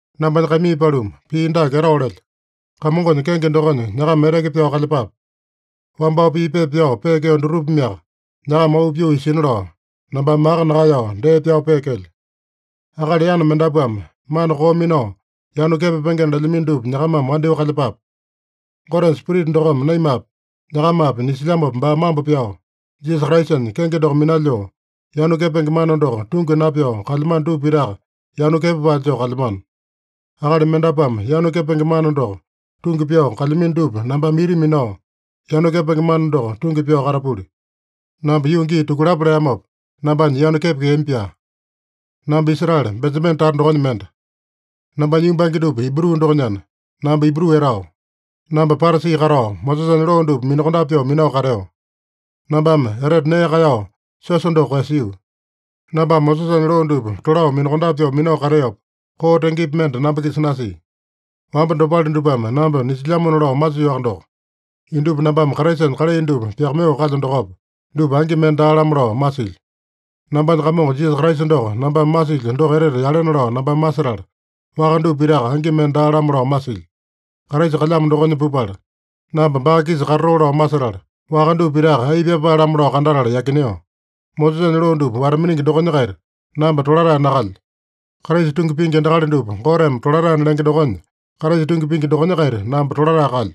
Nambanya kaimii paluma, pii dake etao lelyo: Kamongonya kenge dokonya nyakama eteke pyao kalyepape. Wambao pii pepa pyao peekeo dutupameaka nyakama auu pyoo isina lao, nambame maka nakaeyao dee pyao peekelyo. Akali yana mendapuame mana koo minao yanu kepapengena lelyamino dupa nyakamame wandyoo kalyepape. Gotenya Spirita dokome naimapi, nyakamapi nisilyamopa baa mambo pyao, Jisasa Kraisanya kenge doko minalyoo, yanu kepenge mana doko tungi napyao kalyamano dupa pitaka yanu kepapae joo kalyamano. Akali mendapuame yanu kepenge mana doko tungi pyao kalyamino dupa nambame ita minao, yanu kepenge mana doko tungi pyao katapuli. Namba yuu gii tukulapo leamopa, nambanya yanu kepekeami-pyaa. Namba Israele, Benjamene tata dokonya mende. Nambanya yumbange dupa Ibru dokonyana, namba Ibru etao. Namba Parasi katao, Mosesanya loo dupa minakondape pyoo minao kateo. Nambame etete nee kaeyao siosa doko koeyasio. Nambame Mosesanya loo dupa tolao minakondape pyoo minao kateopa, koo tengepi mende namba-kisa nasia. Wamba dopale dupame namba nisilyamona lao masiowaka doko, indupa nambame Kraisanya kalai dupa pyakamaiyoo kalyo dokopa, dupa angi mende daa-lamo lao masilyo. Nambanya Kamongo Jisasa Kraisa doko nambame masilyo doko etete yalena lao nambame masetala, waka dupa pitaka angi mende daa-lamo lao masilyo. Kraisa kalyamo dokonya pupala, namba baa-kisa katatoo lao masetala, waka dupa pitaka ai pyapae-lamo lao kandatala yakineo. Mosesanya loo dupa wata-miningi dokonya-kaita namba tolatae nakalyo. Kraisa tungi pingi endakali dupa Goteme tolataena lenge dokonya, Kraisa tungi pingi dokonya-kaita namba tolatae kalyo.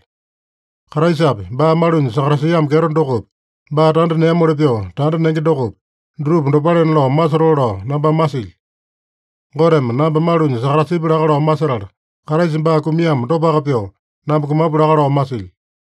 Kraisapi, baa malunya sakatasiamo kyeto dokopi, baa tanda neamoli pyoo tanda nenge dokopi, dutupa dopalena lao masotoo lao nambame masilyo. Goteme namba malunya sakatasipya laka lao masetala, Kraisa baa kumiamo dopaka pyoo, namba kumapu laka lao masilyo.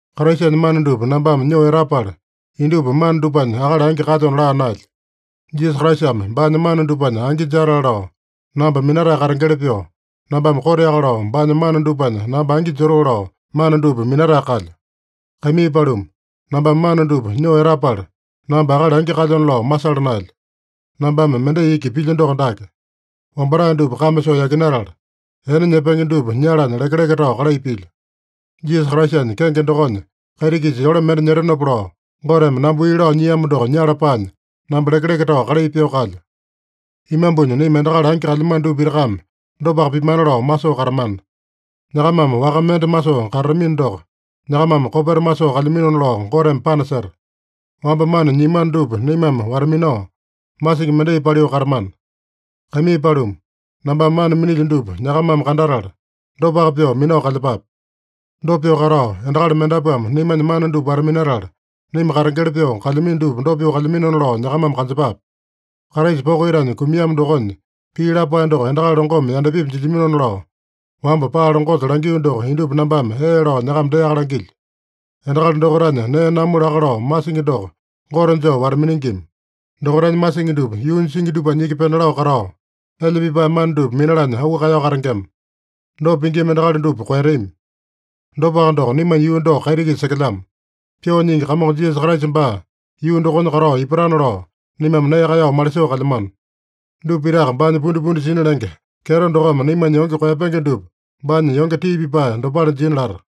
Kraisanya mana dupa nambame nyoo etapala, indupa mana dupanya akali angi kalyona laa naelyo. Jisasa Kraisame baanya mana dupanya angi jatale lao namba minatae katengeli pyoo, nambame koteaka lao baanya mana dupanya namba angi jotoo lao mana dupa minatae kalyo. Kaimii paluma, nambame mana dupa nyoo etapala, namba akali angi kalyona lao masala naelyo. Nambame mendai iki pilyo doko dake: Wambatae dupa kame soo yakinatala, ene nyepenge dupa nyalanya lekeleke tao kalai pilyo. Jisasa Kraisanya kenge dokonya kaiti-kisa yole mende nyetenopa lao, Goteme namba wii lao nyiamo doko nyala paanya, namba lekeleke tao kalai pyoo kalyo. Imambunya naima endakali angi kalyamano dupa pitakame dopaka pimana lao masoo katamana. Nyakamame waka mende masoo katatamino doko, nyakamame kopeta masoo kalyaminona lao Goteme panaseta. Wamba mana nyiamano dupa naimame wata-minao, masingi mendai paliu katamana. Kaimii paluma, nambame mana minilyo dupa nyakamame kandatala, dopaka pyoo minao kalyepape. Dopa pyoo katao, endakali mendapuame naimanya mana dupa wata-minatala, naima katengeli pyoo kalyamino dupa dopa pyoo kalyaminona lao nyakamame kanjepape. Kraisa poko itanya kumiamo dokonya pii lapae doko endakali longome yandapipi jilyaminona lao, wamba paa longosa langio doko indupa nambame ee lao nyakama deaka langilyo. Endakali dokaitanya nee namu laka lao masingi doko gote joo wata-miningima. Dokaitanya masingi dupa yuunya singi dupanya iki pena lao katao, elya pipae mana dupa minalanya auu kaeyao katengema. Dopa pingima endakali dupa koeyatami. Dopaka doko, naimanya yuu doko kaiti-kisa sekelyamo. Pyoo Nyingi Kamongo Jisasa Kraisa baa yuu dokonya katao ipatana lao, naimame nee kaeyao malisoo kalyamano. Dupa pitaka baanya pundipundi sina lenge kyeto dokome naimanya yonge koeyapenge dupa baanya yonge tii pipae dopale jina lata.